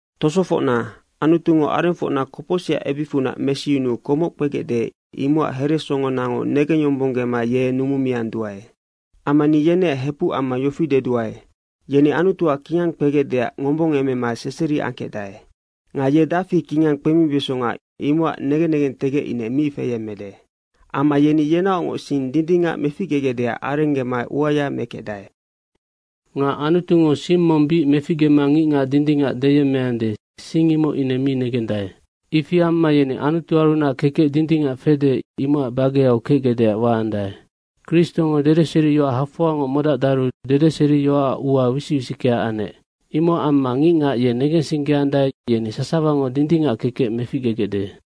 Tosofocna, Anutungo arengfocna kopocsicac ebicfunac mesiyunuu komoc kpegecde, imocac heresongonango negengyombonggema ye numumianduae. Amma ni yeneac hepuc amma yofi deduae, yeni Anutuac kingang kpegecdeac ngombongemema seseri angkecdae. Nga ye dafi kingang kpemibesonga, imocac negen negentegec ine mi feyemmede. Amma yeni yenaocngoc sing dindingac meficgegecdeac arenggema uaya mekecdae. Nga Anutungo sing mong bic meficgema ngicngac dindingac deyemmeande, sing imoc ine mi negendae. Ifi amma yeni Anutuarunac kekec dindingac fede, imocac bageau kecgecdeac waandae. Kristongo dedeseriyoac hafoangoc modacdaru dedeseriyoacac ua wisic wisickea anec. Imocac amma ngicngac ye negensinggeandae, yeni sasawango dindingac kekec meficgegecde.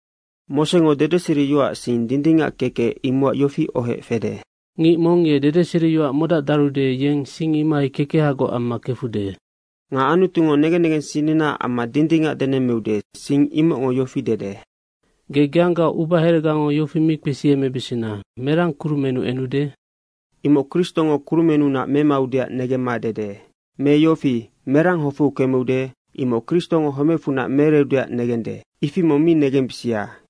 Mosengo dedeseriyoacac sing dindingac kekec imocac yofi ohoec fede, “Ngic mong ye dedeseriyoac modacdarude, yeng sing imohai kekehagoc amma kefude.” Nga Anutungo negen negensinninaac amma dindingac denemmeude, sing imocngo yofi dede, “Ge geanggaoc ubaheregango yofi mi kpesiemebesena, merang kurumennu enude?” Imoc Kristo kurumennunac memaudeac negemma dede. Me yofi, “Merang hofeu kemeude?” Imoc Kristo homecfunac meereudeac negende. Ifi mong mi negembisia.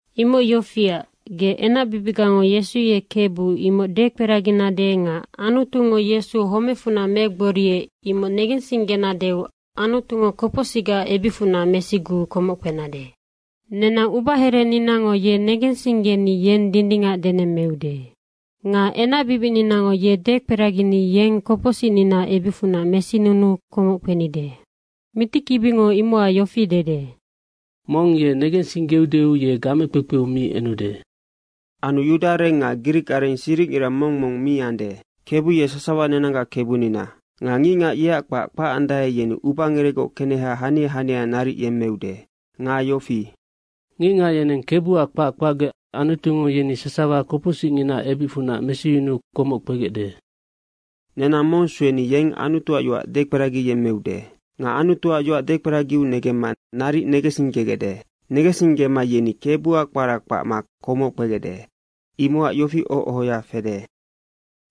Imoc yofiac, ge enacbibicgango, Yesu ye Kebu, imoc dekperaginade nga Anutungo Yesu homecfunac megboriec, imoc negensinggenadeu Anutungo kopocsicgaac ebicfunac mesiguu komoc kpenade. Nenang ubahereninango ye negensinggeni yeng dindingac denemmeude. Nga enacbibicninango ye dekperagini yeng kopocsicninaac ebicfunac mesinunuu komoc kpenide. Mitikibingo imocac yofi dede, “Mongngo ye negensinggeudeu, ye gamekpekpeu mi enude.” Anu yudaareng nga grikareng siricngira mong mong mi ande. Kebu ye sasawa nenanggac Kebunina. Nga ngicngac yeac kpac kpacandae, yeni ubangerecgoc keneha hania hania naric yemmeude. Nga “Ngicngac yeneng KEBUAC kpac kpacgec Anutungo yeni sasawa kopocsicnginaac ebicfunac mesiyunuu komoc kpegecde.” Nenang mong sueni yeng Anutuac yoac dekperagiyemmeude. Nga Anutuac yoac dekperagiu negemma naric negensinggegecde. Negensinggema yeni Kebuac kpara kpacma komoc kpegecde. Imocac yofi oho ohoya fede,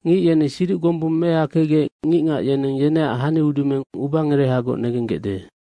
“Ngic yeni siduc gombung mehakecgec ngicngac yeneng yeneac hani udumeng ubangerehagoc negenggecde.”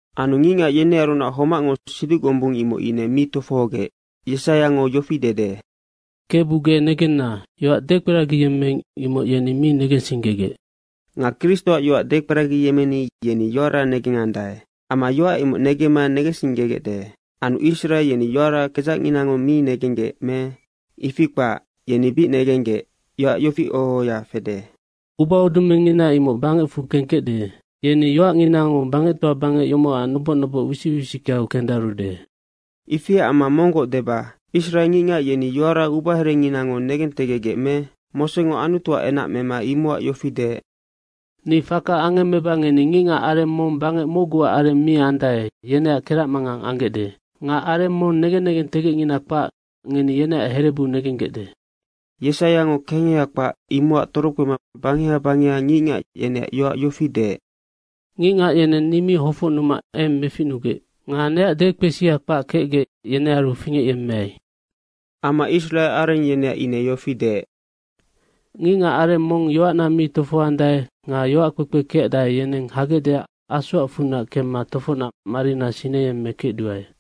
Anu ngicngac yenearunac homacngo siduc gombung imoc ine mi tofohogec. Yesaiango yofi dede, “Kebu ge negenna, yoac dekperagiyemmeing, imoc yeni mi negensinggegec.” Nga Kristoac yoac dekperagiyemmeni yeni yoara negengandae. Amma yoac imoc negemma negensinggegecde. Anu Israe yeni yoara kedzacnginango mi negenggec me? Ifi kpac, yeni bic negenggec. Yofi oho ohoya fede, “Ubaudumengngina imoc bangecfu kengkecde. Yeni yoacnginango bangectoa bangec yomocac noboc noboc wisic wisickeau kendarude.” Ifiac amma monggoc deba, Israe ngicngac yeni yoara ubaherenginango negentegecgec me? Mosengo Anutuac enac mema imocac yofi deec, “Ni faka angemmeba ngeni ngicngac areng mong bangec mocguac areng mi andae, yeneac keracmangang anggecde. Nga areng mong negen negentegecngina kpac, ngeni yeneac herebu negenggecde.” Yesaiango kengeha kpac imocac torokpema bangeha bangeha ngicngac, yeneac yoac yofi deec, “Ngicngac yeneng ni mi hofocnuma eng meficnugec. Nga neac dekpesia kpac kecgec, yenearu fingecyemmeai.” Amma Israe areng yeneac ine yofi deec, “Ngicngac areng mong yoacna mi tofohoandae nga yoac kpekpe kecdae, yeneng hagecdeac asoacfunac kemma tofocnac marina sineyemmekecduae.”